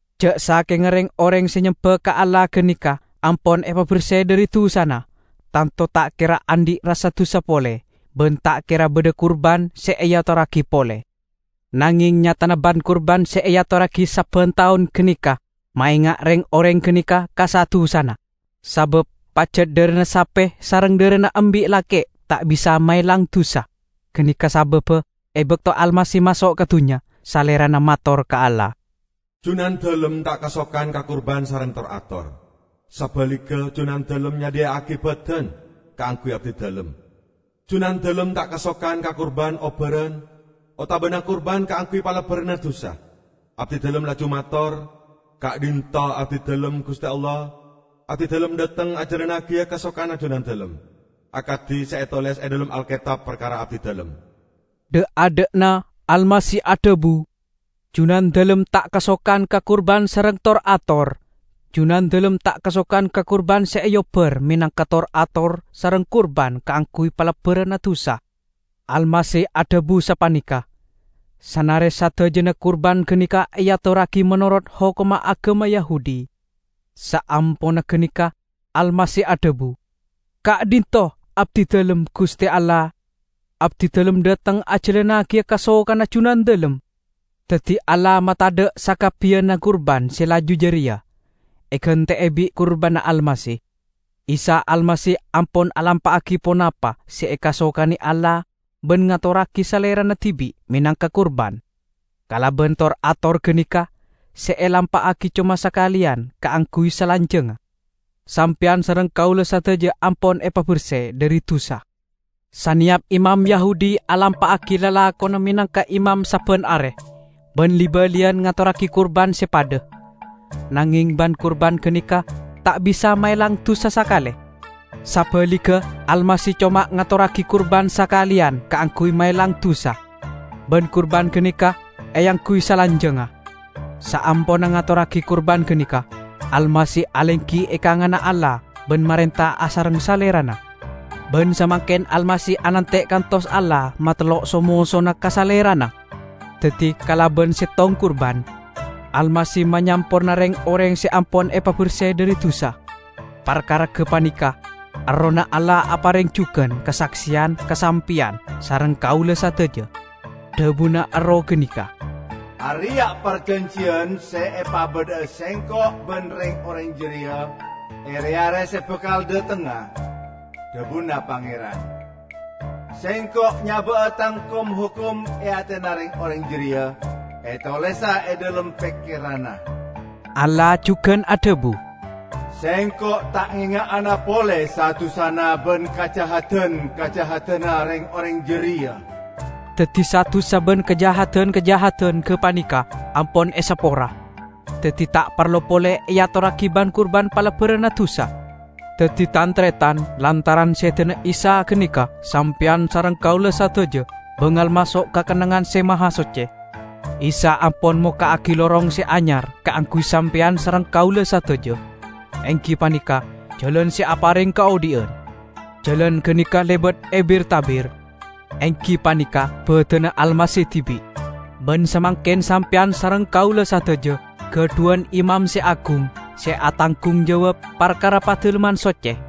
Ja' sakenga reng-oreng se nyemba ka Allah ganeka ampon epaberse dhari dusana, tanto ta' kera andhi' rassa dusa pole, ban ta' kera badha kurban se eatorragi pole. Nangeng nyatana ban-kurban se eatorragi sabban taon ganeka maenga' reng-oreng ganeka ka sa-dusana, sabab pajat dharana sape sareng dharana embi' lake' ta' bisa maelang dusa. Ganeka sababba e bakto Almasih maso' ka dunnya, Salerana mator ka Allah, "Junandalem ta' kasokan ka kurban sareng tor-ator; sabaligga Junandalem nyadhiya'agi badan kaangguy Abdidalem. Junandalem ta' kasokan ka kurban obbaran otabana kurban kaangguy palebbaranna dusa. Abdidalem laju mator, 'Ka'dhinto' Abdidalem, Guste Allah! Abdidalem dhateng ajalannagiya kasokanna Junandalem, akadi se etoles e dhalem Alketab parkara Abdidalem.' " Dha'-adha'na Almasih adhabu, "Junandalem ta' kasokan ka kurban sareng tor-ator; Junandalem ta' kasokan ka kurban se eobbar menangka tor-ator sareng kurban kaangguy palebbaranna dusa." Almasih adhabu sapaneka, sanare sadajana kurban ganeka eatorragi menorot hokomma agama Yahudi. Saamponna ganeka Almasih adhabu, "Ka'dhinto' Abdidalem, Guste Allah! Abdidalem dhateng ajalannagiya kasokanna Junandalem." Daddi Allah matadha' sakabbiyanna kurban se laju jareya, egante'e bi' kurbanna Almasih. Isa Almasih ampon alampa'agi ponapa se ekasokane Allah ban ngatorragi Salerana dibi' menangka kurban. Kalaban tor-ator ganeka, se elampa'agi coma sakaleyan kaangguy salanjangnga, sampeyan sareng kaula sadaja ampon epaberse dhari dusa. Saneyap imam Yahudi alampa'agi lalakonna menangka imam sabban are, ban li-baliyan ngatorragi kurban se padha. Nangeng ban-kurban ganeka ta' bisa maelang dusa sakale. Sabaligga, Almasih coma ngatorragi kurban sakaleyan kaangguy maelang dusa, ban kurban ganeka eangguy salanjangnga. Saamponna ngatorragi kurban ganeka, Almasih alenggi e kanganna Allah ban marenta asareng Salerana. Ban samangken Almasih anante' kantos Allah matellok so-mosona ka Salerana. Daddi kalaban settong kurban, Almasih manyamporna reng-oreng se ampon epaberse dhari dusa. Parkara gapaneka Errohna Allah apareng jugan kasakseyan ka sampeyan sareng kaula sadaja. Dhabuna Erroh ganeka, " 'Areya' parjanjiyan se epabadha'a Sengko' ban reng-oreng jareya, e re-are se bakal dhatengnga,' dhabuna Pangeran. 'Sengko' nyaba'a Tang kom-hokom e atena reng-oreng jareya, etolesa e dhalem pekkeranna.' " Allah jugan adhabu, "Sengko' ta' ngenga'ana pole sa-dusana ban kajahadan-kajahadanna reng-oreng jareya." Daddi sa-dusa ban kajahadan-kajahadan gapaneka ampon esapora, daddi ta' parlo pole eatorragi ban-kurban palebbaranna dusa. Daddi, tan-taretan, lantaran sedana Isa ganeka sampeyan sareng kaula sadaja bangal maso' ka Kennengngan Se Mahasocce. Isa ampon mokka'agi lorong se anyar kaangguy sampeyan sareng kaula sadaja, enggi paneka jalan se apareng kaodhi'an. Jalan ganeka lebat e bir-tabir, enggi paneka badanna Almasih dibi'. Ban samangken sampeyan sareng kaula sadaja gadhuwan imam se agung, se atanggung jawab parkara Padalemman Socce.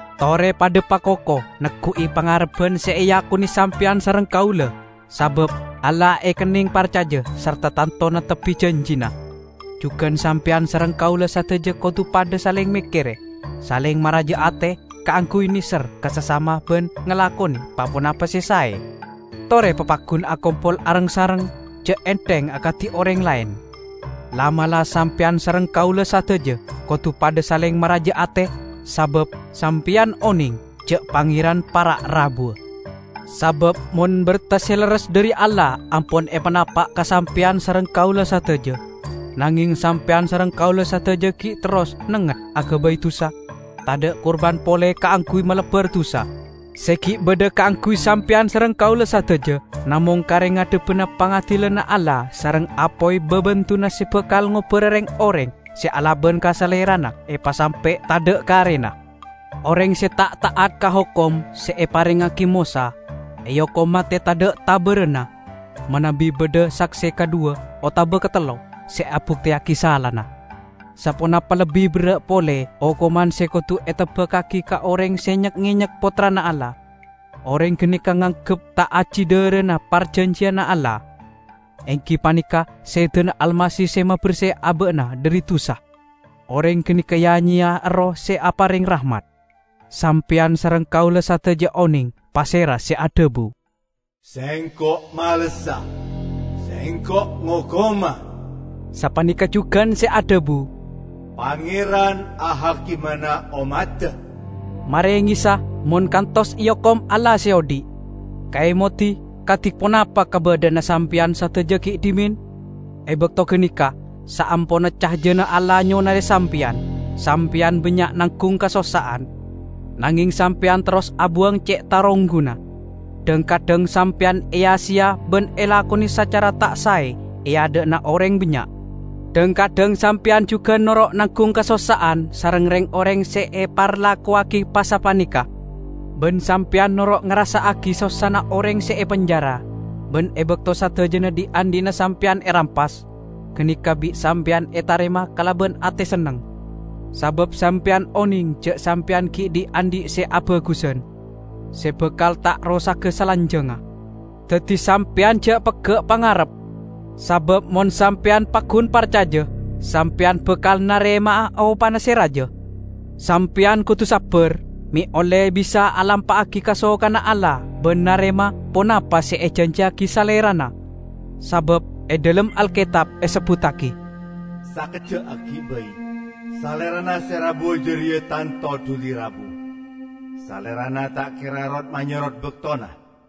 Tore padha pakoko neggu'i pangarebban se eakone sampeyan sareng kaula, sabab Allah ekenneng parcaja sarta tanto neptebbi janjina. Jugan sampeyan sareng kaula sadaja kodu padha saleng mekkere, saleng maraja ate kaangguy neser ka sasama ban ngalakone pa-ponapa se sae. Tore papaggun akompol areng-sareng, ja' entheng akadi oreng laen. La'-mala' sampeyan sareng kaula sadaja kodu padha saleng maraja ate, sabab sampeyan oneng ja' Pangeran para' rabuwa. Sabab mon berta se lerres dhari Allah ampon epanapa' ka sampeyan sareng kaula sadaja, nangeng sampeyan sareng kaula sadaja gi' terros nengnget agabay dusa, tadha' kurban pole kaangguy malebbar dusa. Se gi' badha kaangguy sampeyan sareng kaula sadaja namong kare ngadhebbana pangadilanna Allah sareng apoy babendunna se bakal ngobbara reng-oreng se alaban ka Salerana epasampe' tadha' karena! Oreng se ta' ta'at ka hokom se eparengngagi Mosa, eokom mate tadha' tabaranna, manabi badha sakse kadhuwa otaba katello se abukteyagi salana. Saponapa lebbi berra' pole okoman se kodu eteba'agi ka oreng se nyek-ngenyek Pottrana Allah. Oreng ganeka nganggep ta' aji dharana parjanjiyanna Allah, enggi paneka sedana Almasih se maberse aba'na dhari dusa. Oreng ganeka ya-nyeya Erroh se apareng rahmat. Sampeyan sareng kaula sadaja oneng pasera se adhabu, "Sengko' malessa! Sengko' ngokoma!" sapaneka jugan se adhabu, "Pangeran ahakimana ommadda." Marengessa mon kantos eokom Allah Se Odhi'! Kaemodi kadi ponapa kabadha'anna sampeyan sadaja gi' dhimen. E bakto ganeka, saamponna cajana Allah nyonare sampeyan, sampeyan bannya' nanggung kasossa'an, nangeng sampeyan terros abuwang ce' tarongguna. Dhang-kadhang sampeyan eya-seya ban elakone sacara ta' sae e adha'na oreng bannya'. Dhang-kadhang sampeyan jugan noro' nanggung kasossa'an sareng reng-oreng se eparlakowagi pasapaneka, ban sampeyan noro' ngarassa'agi sossana oreng se epenjara. Ban e bakto sadajana dhi'-andhi'na sampeyan erampas, ganeka bi' sampeyan etarema kalaban ate senneng, sabab sampeyan oneng ja' sampeyan gi' dhi'-andhi' se abagusan, se bakal ta' rosaga salanjangnga. Daddi sampeyan ja' pegga' pangarep, sabab mon sampeyan paggun parcaja, sampeyan bakal narema'a opana se raja! Sampeyan kodu sabbar, me' olle bisa alampa'agi kasokanna Allah ban narema ponapa se ejanjiyagi Salerana. Sabab e dhalem Alketab esebbuttagi, "Sakejja' aggi' bai, Salerana se rabuwa jareya tanto duli rabu; Salerana ta' kera rot-manyorot baktona.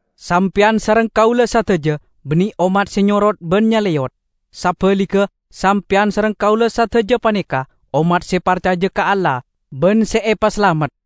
Sampeyan sareng kaula sadaja banne ommat se nyorot ban nyaleyot. Sabaligga, sampeyan sareng kaula sadaja paneka ommat se parcaja ka Allah ban se epasalamet.